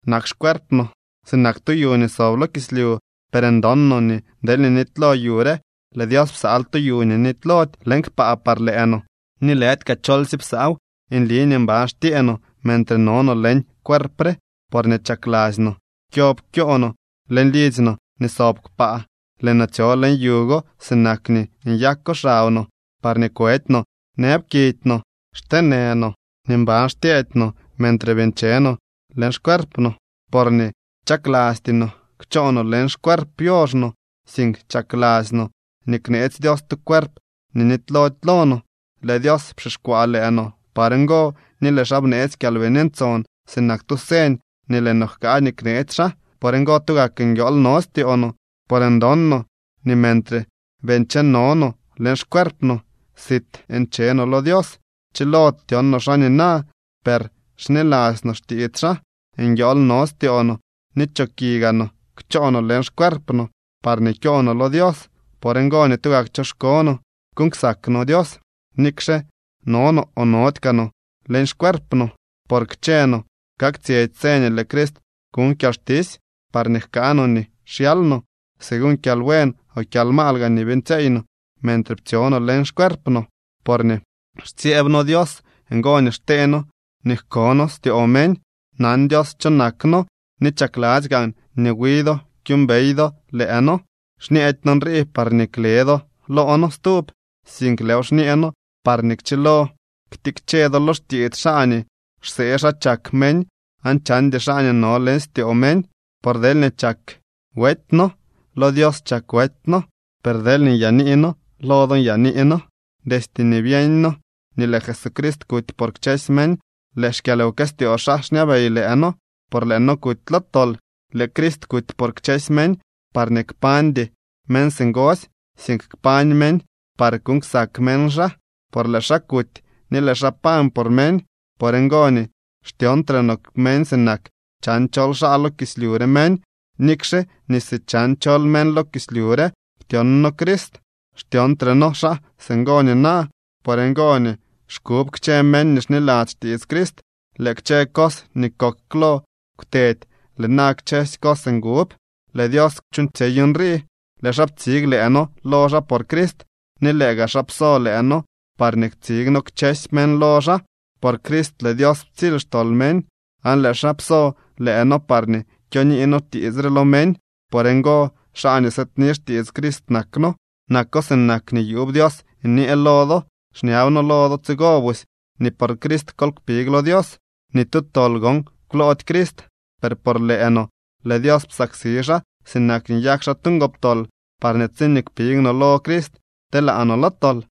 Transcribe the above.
Nak xcuerp no sinak tu yu nii sob lo kislyu, per ndon no nii deelñee nitylo yu re, lëë Dios psaal tu yu nii nitylody leñ kpaa par lëë no, ni lëdy kaa cholsye psaaw. Nli nii mban xtyee no mentre no no leñ cuerp re, porñee chakladzy no kyob kyoo no leñ lidzy no nii sob kpaa, lëë no tsyo leñ yu go sinak nii nyako xab no parñee kwedy no nëb kidy no. Xteenë no ni mban xtyeedy no mentre bii ncheno no leñ xcuerp no, porñee chaklasty no kchoo no leñ xcuerp yoox no, sink chakladzy no nii kneetsy Dios tu cuerp nii nitylody lo no. Lëë Dios pxixkwaa lëë no par ngo ni lëë xaa bneetsy Kyalbini Ntson sinak tu señ nii lëë no jkaa nii kneetsy xaa. Por ngo, tugak nguiool no styoo no, por ndon no nii mentre bii ncheno no leñ xcuerp no, sit nche no lo Dios. Chilody tyon no xaa nina, per xniladzy no xtiits xaa. Nguiool no styoo no ni choki gaa no kchoo no leñ xcuerp no, parñee kyoo no lo Dios. Por ngo nii tugak choxko no kuuñ ksak no Dios, nikxe no no o nody kaa no leñ xcuerp no. Por kchë no kaktsyetsy tse nii lëë Crist kuñ kyalxtisy, parñee jkaa no nii xyaal no, según kyalbuen o kyalmaal gaa nii beeñtsyeey no mentre ptsyo no leñ xcuerp no. Porñee xtsyeeb noo Dios ngo nii xtee noo nii jko noo styoo meñ. Nan Dios cho nak noo ni chakladzy gaan nii wi do kyuumbey do lëë noo. Xñeedy noo nrii parñee kle do loo noo stub, sink lëëw xñee noo parñee kchilo ktikche do lo xtiits xaa nii xsee xa chak meñ aan chandy xaa nii no leñ styoo meñ. Por deelñee chak wety noo, lo Dios chak wety noo. Per deelñee nyaanii noo, lo do nyaanii noo. Destye nii byeeñ noo nii lëë Jesucrist kuty por kchësy meñ, lëë xkyalwkëstyoo xaa xñabey lëë noo, por lëë noo kuty lo tol. Lëë Crist kuty por kchësy meñ, parñee kpañdy meñ singosy, sink kpañ meñ par kuuñ ksak meñ xaa, por lëë xaa kuty ni lëë xaa pañ por meñ. Por ngo nii xtyoontre noo meñ sinak chan chol xaa lo kislyu re meñ. Nikxe nii si chan chol meñ lo kislyu re ptyon noo Crist, xtyoontre noo xaa singo nina. Por ngo nii xkub kchë meñ nii xniladzy xtiits Crist. Lëë kchë cos nii kok klo kwtedy. Lëë na kchësy cos ngub. Lëë Dios chuuñtsyey nrii. Lëë xaa ptsig lëë noo lo xaa por Crist, ni lëë gaa xaa pso lëë noo parñee ktsig noo kchësy meñ lo xaa. Por Crist lëë Dios ptsily xtol meñ, aan lëë xaa pso lëë noo parñee kyonii noo tiits re lo meñ. Por ngo xaa nii sëëdni xtiits Crist nak noo. Nako sinak nii yuub Dios nyee lo do. Xñab noo lo do tsigo busy nii por Crist kol kpig lo Dios. Ni tu tol gon kwloody Crist, per por lëë no lëë Dios psaksi xaa sinak nii nyak xaa tu ngoptol, parñee tsiñee kpig no lo Crist, telaa no lo tol.